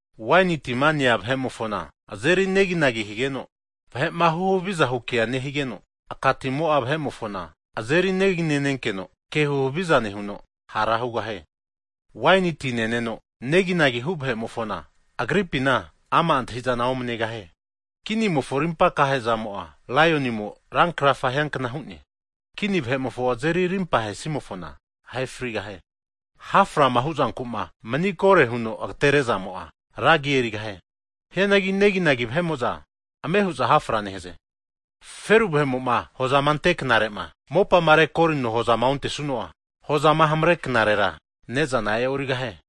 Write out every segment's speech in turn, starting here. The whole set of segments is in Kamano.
Waini tima nenea vahe'mofona azeri neginagi higeno, vahe'ma huhaviza hu kea nehigeno, aka timo'a vahe'mofona azeri negi nenkeno ke huhaviza nehuno hara hugahie. Waini ti neno neginagi hu vahe'mofona, agripina ama' antahizana omanegahie. Kinimofo arimpa akahe zamo'a, laionimo rankrafa hiankna hu'ne. Kini vahe'mofo azeri arimpa ahe'simofona, ahe frigahie. Ha' frama hu'zanku'ma mani kore huno agatere'zamo'a, ra agi erigahie. Hianagi neginagi vahe'mo'za ame hu'za hafra nehaze. Feru vahe'mo'ma hozama ante knare'ma mopama rekorino hozama ontesuno'a, hozama hamare knarera ne'zana ohamaregahie.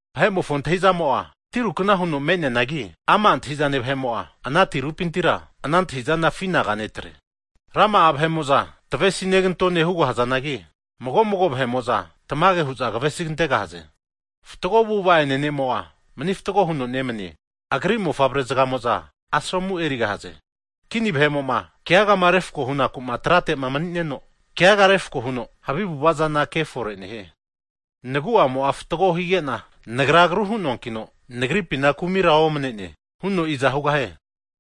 Vahe'mofo antahi'zamo'a tirukna huno me'neanagi, ama' antahizane vahe'mo'a ana tirupintira ana antahizana afi anaga netre. Rama'a vahe'mo'za, tavesi negantone hugahazanagi, mago mago vahe'mo'za tamage hu'za kavesigante'gahaze. Fatgo avu'ava'ene ne'mo'a, mani fatgo huno nemanie. Agri mofavre zgamo'za, asomu erigahaze. Kini vahe'mo'ma keagama refako hunaku'ma trate'ma mani'neno, keaga refko huno havi avu'avazana ke fore nehie. Nagu'amo'a fatgo higena, nagra agru hu'noankino nagripina kumira omane'ne huno iza hugahie?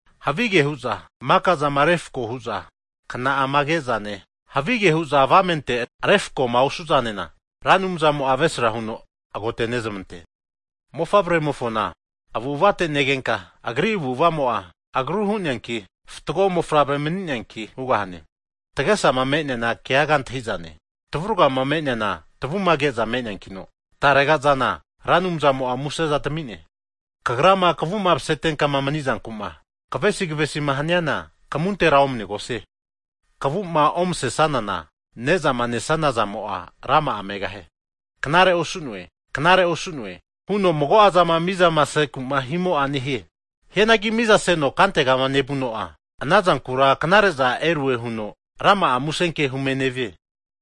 Havige hu'za makazama refko huza kna'ama ke'zane, havige hu'za avamente refkoma osu'zanena Ra Anumzamo'a avesra huno agotenezmante. Mofavremofona avu'avate negenka, agri avu'avamo'a agru hu'neanki, fatgo mofavre mani'neanki hugahane. Tagesama me'neana keaga antahizane, tavuragama me'neana tavuma ke'za me'neankino tarega'zana Ra Anumzamo museza tami'ne. Kagrama kavu'ma masetenka manizankuma kavesi kavesima haniana, kamuntera omanegosie. Kavu'ma omasesanana ne'zama nesana zamo'a rama'a megahie. Knare osu'ne! Knare osune! Huno mago'a zama mizama seku'ma himo'a nehie. Hianagi mizaseno kantegama nevuno'a, ana zankura knare'za erue huno rama'a muse ke hume nevie.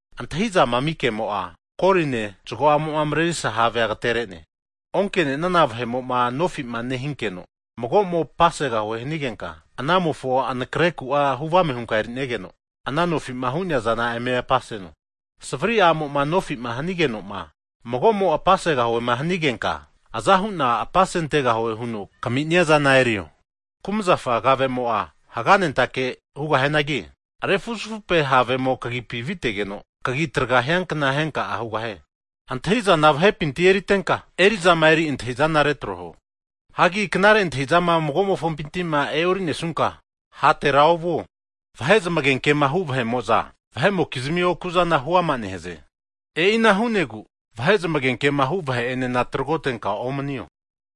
Antahizama ami kemo'a, koline zago'amo'ma marerisa havea ageterene. Onke'nenana vahe'mo'ma nofima nehinkeno magomo apasegahue hanigenka, anamofo anakreku'a huvame hunka eri'negeno, ana nofima hu'neazana eme apaseno. Savri a'mo'ma nofima hanigenoma mago'mo apasegahue'ma hanigenka, aza hu'na apasentegahue huno kaminia zana erio. Kumzafa kave'mo'a haganentake hugahianagi, refuzufupe havemo kagipi aviteno kagi traga hiankna henka'a hugahie. Antahi'zana vahepinti erintenka erizama eri antahizana retro huo. Hagi knare antahi'zama mago'mofompinti'ma e'orinesunka hatera ovuo. Vahe zamagenkema hu vahe'moza vahe'mokizmi oku'zana hu ama nehaze. E'ina hunegu vahe zamagenkema hu vahe enena tragotenka omanio.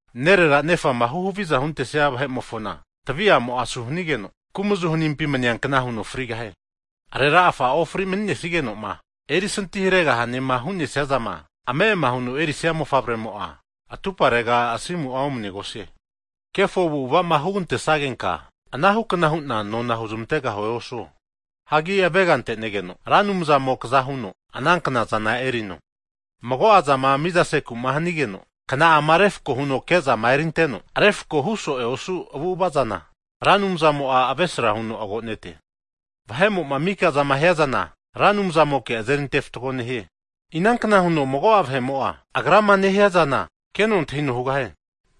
Nerera nefama huhaviza huntesia vahe'mofona tvi'amo asu hanigeno kumazu hanimpi maniankna huno frigahie. Arera a'fama ofri maninesigeno'ma erisinti haregahanema hu'nesia zama ame'ama huno erisia mofavremo'a, atuparega asimu'a omanegosie. Kefo avu'avama hugante'sagenka anahukna huna nona huzamantegahue osuo. Hagi avega antenegeno Ra Anumzamo kaza huno ana knazana erino. Mago'azama mizaseku'ma hanigeno kna'ama refako huno kezama (skel) erinteno refako hu so'e osu avu'avazana, Ra Anumzamo'a avesra huno agonete. Vahe'mo'ma mika zama hiazana, Ra Anumzamoke azeri ante fatgo nehie. Inankna huno mago'a vahemo'a agra'ma nehia zana keno antahino hugahie?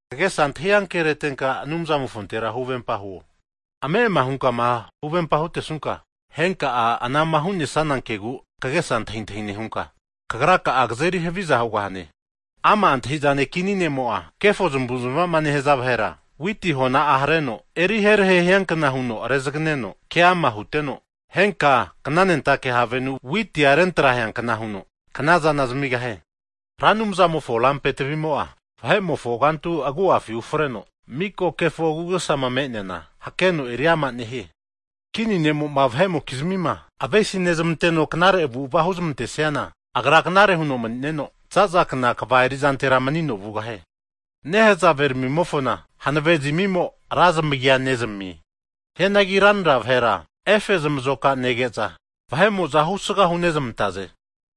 Kagesa antahi ankeretenka Anumzamofontera huvempa huo. Ame'ama hunka huvempama hutesunka henka'a anama hu'nesana kegu kagesa antahintahi nehunka kagraka'a kazeri haviza hugahane. Ama' antahizane kini ne'mo'a kefo zamavu'zamava nehza vahera witi hona'a hareno eriherahe hianka huno rezaganeno ke ama huteno, henka knanentake havenu witi'a refuzafupeankna huno knazana zamigahie. Ra Anumzamofo lampe tvi'mo'a, vahe'mofo kantu agu'afi ufreno mika kefo agu'agesama me'neana hakeno eri ama nehie. Kini ne'mo'ma vahe'mokizmima avesi nezamanteno knare avu'ava huzamantesiana, agra knare huno mani'neno, zaza kna kva eri'zantera manino vugahie. Nehazave ramimofona hanave zamimo ra zamagia nezamie. Hianagi ranra vahera efe'zmazoka nege'za vahe'mo'za husga hunezmantaze.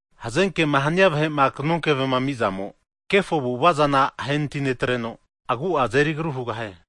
Hazenkema hania vahe'ma knokeve'ma ami'zamo, kefo avu'avazana ahenati netreno, agu'a azeri agru hugahie.